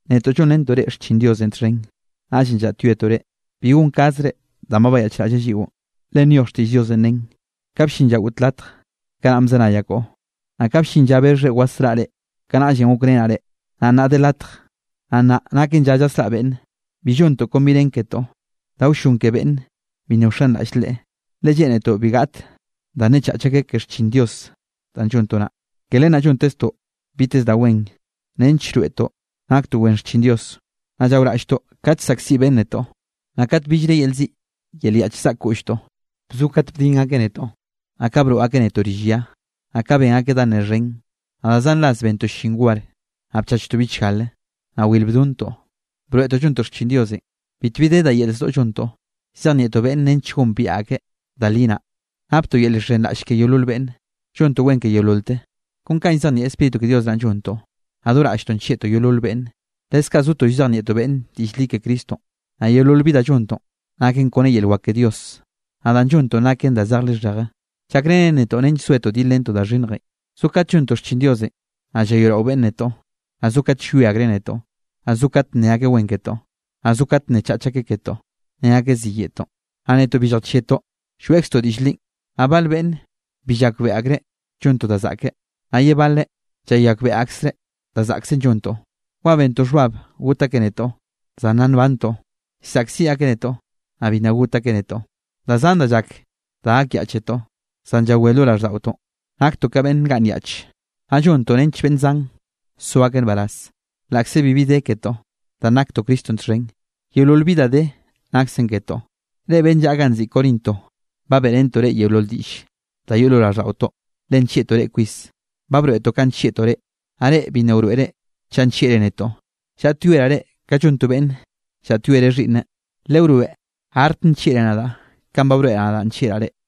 Netoꞌ llonrentoꞌ reꞌ xchin Diosenꞌ txhen. Naꞌllenꞌ llaꞌtyoetoꞌ reꞌ, bi gonkazre danꞌ ba bayaꞌchraꞌlleꞌ lliꞌo. Le nyoj leꞌ xtiꞌll Diosenꞌ, nen: Kanꞌ bllin lla goꞌt latj, kanaꞌ bzenayaꞌ koꞌo. Naꞌ kanꞌ bllin lla bexhre wasraꞌa reꞌ, kanaꞌllenꞌ gokrenaꞌ reꞌ. Naꞌ nnaꞌn de latj, naꞌ nnaꞌ naken lla llasraꞌa beꞌnne. Bi llontoꞌ kon bi nen ketoꞌ, da wllon ke beꞌnne bi nna wxenraꞌll Leꞌe, le lleꞌnetoꞌ bi gaꞌt da nnechach akeꞌ ke xchin Dios danꞌ llontoꞌ naꞌ. Ke len naꞌ llonteztoꞌ biteze da wen nench llroeꞌtoꞌ naktoꞌ wen xchin Dios. Naꞌ llaoraꞌlltoꞌ kat llsaꞌkziꞌ beꞌnne netoꞌ, naꞌ kat billre yel ziꞌ yel yaꞌch zaꞌk koꞌlltoꞌ. Bzo kat bdin akeꞌ netoꞌ, naꞌ ka broꞌ akeꞌ netoꞌ rill ya, naꞌ ka ben akeꞌ da ne xhen. Naꞌ da zan ras bentoꞌ llin war, naꞌ bchachtoꞌ bichgale, naꞌ wil bdontoꞌ. Broeꞌtoꞌ llontoꞌ xchin Diosenꞌ, bitbi de da yel zdoꞌ llontoꞌ. Llzejnieꞌtoꞌ beꞌnne nench gombiaꞌ akeꞌ da li naꞌ, naptoꞌ yel llxhenraꞌlle ke yeolol beꞌnne, llontoꞌ wen ke yeololteꞌ. Kon kanꞌ llzejnieꞌ Spíritu ke Dios naꞌ llontoꞌ, naꞌ do raꞌlltoꞌ nllieꞌtoꞌ yeolol beꞌnne. Leskaꞌ zotoꞌ llzejnieꞌtoꞌ beꞌnn diꞌll li ke Cristonꞌ, naꞌ yeolol bi danꞌ llontoꞌn naken kone yel wak ke Dios. Naꞌ danꞌ llontoꞌn naken da zej lixheje, llakrenen nench zoetoꞌ dilrentoꞌ da xhinnjenꞌ. Zo kat llontoꞌ xchin Diosenꞌ, naꞌ llayoeꞌrao beꞌnne netoꞌ, naꞌ zo kat llwie akreꞌ netoꞌ, naꞌ zo kate nne akeꞌ wen ketoꞌ, naꞌ zo kat nnechach akeꞌ ketoꞌ. Ne akeꞌ ziyeꞌtoꞌn, naꞌ netoꞌ bi lljachieꞌtoꞌ lloeꞌkztoꞌ diꞌll linꞌ. Naꞌ bale beꞌnne bi llakbeꞌe akreꞌ llontoꞌ da zaꞌke, naꞌ ye baleꞌ llayakbeꞌe akreꞌ da zaꞌksen llontoꞌ. Wa bentoꞌ xhbab got akeꞌ netoꞌ, zan nna nbantoꞌ. Llsaꞌkziꞌ akeꞌ netoꞌ, naꞌ bi nna got akeꞌ netoꞌ. Da zan da llak da gakyaꞌchetoꞌ, zan llawé lo raꞌlldaꞌotoꞌn. Naktoꞌ ka beꞌnn ngaꞌnnyaꞌch, naꞌ llontoꞌ nench beꞌnn zan so akeꞌ nbaraz. Laꞌkze bibi de ketoꞌ, danꞌ naktoꞌ Cristonꞌ txhen, yeolol bi da de naksen ketoꞌ. Reꞌ beꞌnn llaꞌa ganꞌ nziꞌi Corinto, ba beꞌrentoꞌ reꞌ yeolol diꞌll da yoꞌ lo raꞌlldaꞌotoꞌ, le nllieꞌtoꞌ reꞌ kwis. Ba broeꞌtoꞌ kanꞌ nllieꞌtoꞌ reꞌ, naꞌ reꞌ bi nna wroeꞌre chaꞌ nllieꞌre netoꞌ. Llaꞌtyoeraꞌ reꞌ ka llon to beꞌnne llaꞌtyoereꞌ xhiꞌnneꞌ, lewroeꞌ artk nllieꞌre nadaꞌ kanꞌ ba broeꞌraꞌ nadaꞌ nllieꞌraꞌ reꞌ.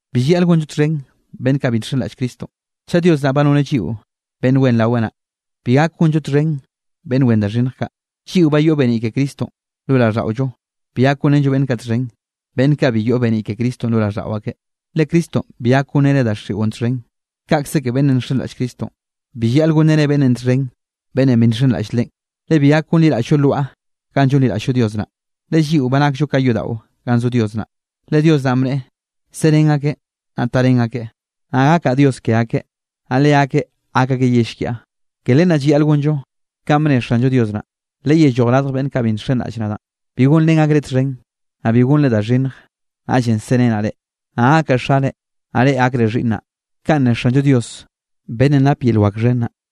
Bi llayaꞌl gonllo txhen beꞌnn kaꞌ bi nxenraꞌll Cristonꞌ. Chaꞌ Dios naꞌ ba noneꞌ lliꞌo beꞌnn wen raweꞌ naꞌ, bi gak gonllo txhen beꞌnn wen da xhinnj kaꞌ. Lliꞌo ba yoꞌ beniꞌ ke Cristonꞌ lo raꞌlldaꞌollo, bi gak gonrenllo beꞌnn kaꞌ txhen, beꞌnn kaꞌ bi yoꞌ beniꞌ ke Cristonꞌ lo raꞌlldaꞌo akeꞌ. Le Cristonꞌ bi gak gonreneꞌ daxiꞌon txhen, kaꞌkze ke beꞌnnenꞌ nxenraꞌll Cristonꞌ, bi llayaꞌl gonreneꞌ beꞌnnenꞌ txhen beꞌnnenꞌ bi nxenraꞌll Leꞌen. Le bi gak gonliraꞌll-llo lwaꞌa ganꞌ llonliraꞌll-llo Dios naꞌ, le lliꞌo ba nakllo ka yodaꞌo ganꞌ zo Dios naꞌ. Le Dios naꞌn bneꞌe: Serén akeꞌ, naꞌ tarén akeꞌ. Naꞌ gakaꞌ Dios ke akeꞌ, naꞌ leakeꞌ gak akeꞌ yell kiaꞌ. Ke len naꞌ llayaꞌl gonllo kanꞌ bne Xanllo Dios naꞌ: Leyelloj radj beꞌnn kaꞌ bi nxenraꞌll nadaꞌn, bi gonrén akreꞌ txhen. Naꞌ bi gonre da xhinnj. Naꞌllenꞌ serenaꞌ reꞌ. Naꞌ gakaꞌ Xare, naꞌ reꞌ gakre xhiꞌnnaꞌ. Kaꞌn ne Xanllo Dios beꞌnnenꞌ nap yel wak xhen naꞌ.